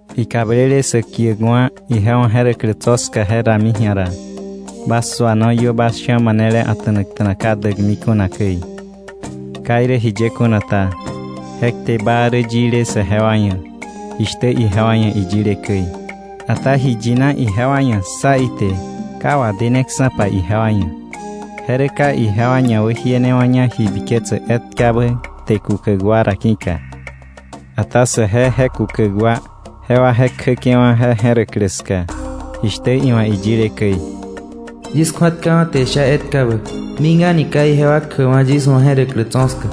Ikablele sä kiäkwa̱ ije wa̱ je̱räklä tso̱ ska je rami ji̱a ra, bas suano iö bas sha̱ manele a̱ta̱nakta̱na ka däkmi kuna käi. Ka irä jiye kuna ta, je kte baa rä yile saje wa ia̱ jishtä ijewa ia̱ iyile käi, ata ji yina ijewa ia̱ ssa ite ka wadeneksa̱pa ijewa ia̱, je rä ka ijewa ñawäjienewa̱ña ji biketsäk etkabä kte kukäk wa ra ki̱ka. Ata saje je kukäk wa, jewa je kjäke̱wa̱ je je̱räklä ska, jishtä iwa̱ iyile käi: “Yis kju̱atkawa̱ te isha etkabä: ‘Mik a̱ni ka ijewa kjäkwa̱ yis wa̱ je̱räklä tso̱ ska.’”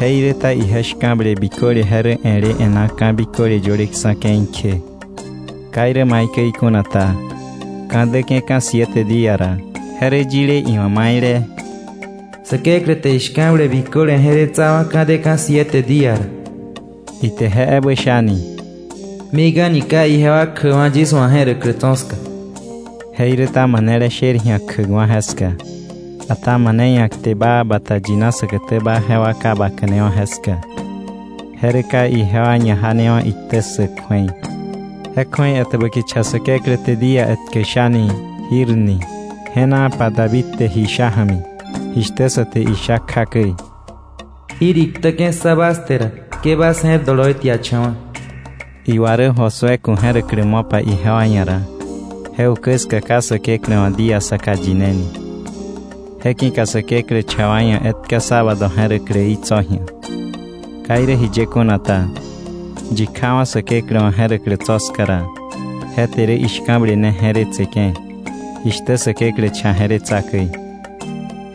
Jeiräta ije shka̱ble biköle je rä e̱le e̱ná ka̱ biköle yöleksa̱ ke̱i kje. Ka irä maikäi kuna ta, ka̱ däke̱ka̱ siete día ra, je rä yile iwa̱ maile: “Säkeklä te ishka̱ble biköle je̱retsawa̱, ka̱ deka̱ siete día ra.” Ite je ebä shani: “Mik a̱ni ka ijewa kjäkwa̱ yis wa̱ je̱räklä tso̱ ska.” Jeiräta manele sher ji̱a kjäkwa̱ jeska, ata mane ia̱ kte baa bata yina säkätäba jewa ka baka̱newa̱ jeska, je rä ka ijewa ñajanewa̱ iktä ssäk kju̱ei. Je kju̱ei etäbä kicha Säkeklä te día etkä shani: “Jir” ni, je̱naapa David wa̱ iyile oloi ja̱mi, jishtä sa te isha kja käi: “Jir iktäke̱ ssa bas te ra, ke bas je̱r doloi tiacha̱wa̱.” Iwa rä Josué ku̱ je̱räklä mo̱pa ijewa ia̱ ra, je ukä ska ka Säkeklä wa̱ día saka yineni. Je ki̱ka Säkeklä cha wa ia̱ etka sábado je̱räkläí tso̱ ji̱a. Ka irä jiye kuna ta, yi kjawa̱ Säkeklä wa̱ je̱räklä tso̱ ska ra, je te rä ishka̱ble ne je̱retseke̱, jishtä Säkeklä cha je̱retsa käi.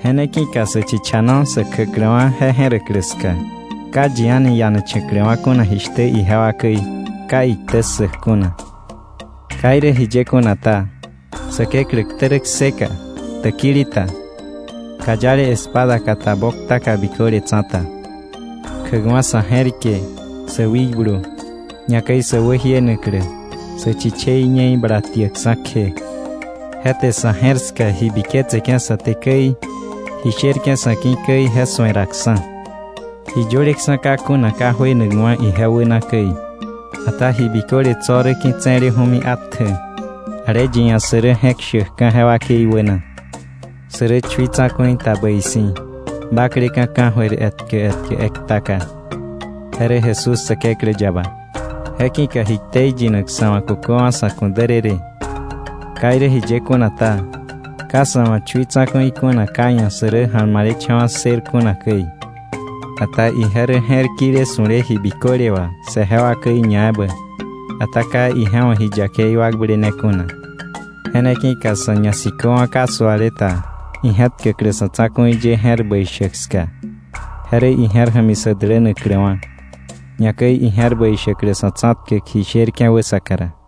Je ne ki̱ka sä chichano sä kjäkläwa̱ je je̱räklä ska, ka yi a̱ni ianacha̱kläwa̱ kuna jishtä ijewa käi ka iktä ssäk kuna. Ka irä jiye kuna ta, Säkeklä ktä rä kseka, täkili ta, kayale espada ka ta boktaka biköle tsa̱ta, kjäkwa̱ sa̱ je̱rike, sä wikblu, ñakäi sä wäjienaklä, sä chichei ñe̱i bala tiäkksa̱ kje. Je te sa̱ je̱r ska ji biketseke̱ sa te käi, ji sherke̱ sa̱ ki̱ käi, je su̱eraksa̱. Ji yöleksa̱ ka kuna ka juenakwa̱ ije wäna käi. Ata ji biköle tso̱ rä ki̱tse̱leju̱mi atjä, ale yi ia̱ sä rä je̱k shäkka̱ je wakei wäna. Sä rä chui tsa̱ku̱i ta bäi si̱, bakleka̱ ka̱jöir etkä etkä ektaka. Je rä Jesús Säkeklä yaba. Je ki̱ka ji ktei yinak sa̱ wa̱ kuköwa̱ sa̱ ku̱ därërë. Ka irä jiye kuna ta, ka sa̱ wa̱ chui tsa̱ku̱i kuna ka iia̱ sä rä ja̱lmalecha̱wa̱ ssër kuna käi. Ata ije rä je̱r kile su̱le ji biköle wà saje wa käi ñaebä, ata ka ije wa̱ ji yakei wakblene kuna. Je ne ki̱ka sa̱ ñasiköwa̱ ka suale ta ije̱tkäklä sa̱ tsa̱ku̱i ye je̱r bäi shäk ska. Je rä ije̱r ja̱mi sä dälänakläwa̱, ñakäi ije̱r bäi shäklä sa̱ tsa̱tkäk ji sherke̱ wäsaka ra.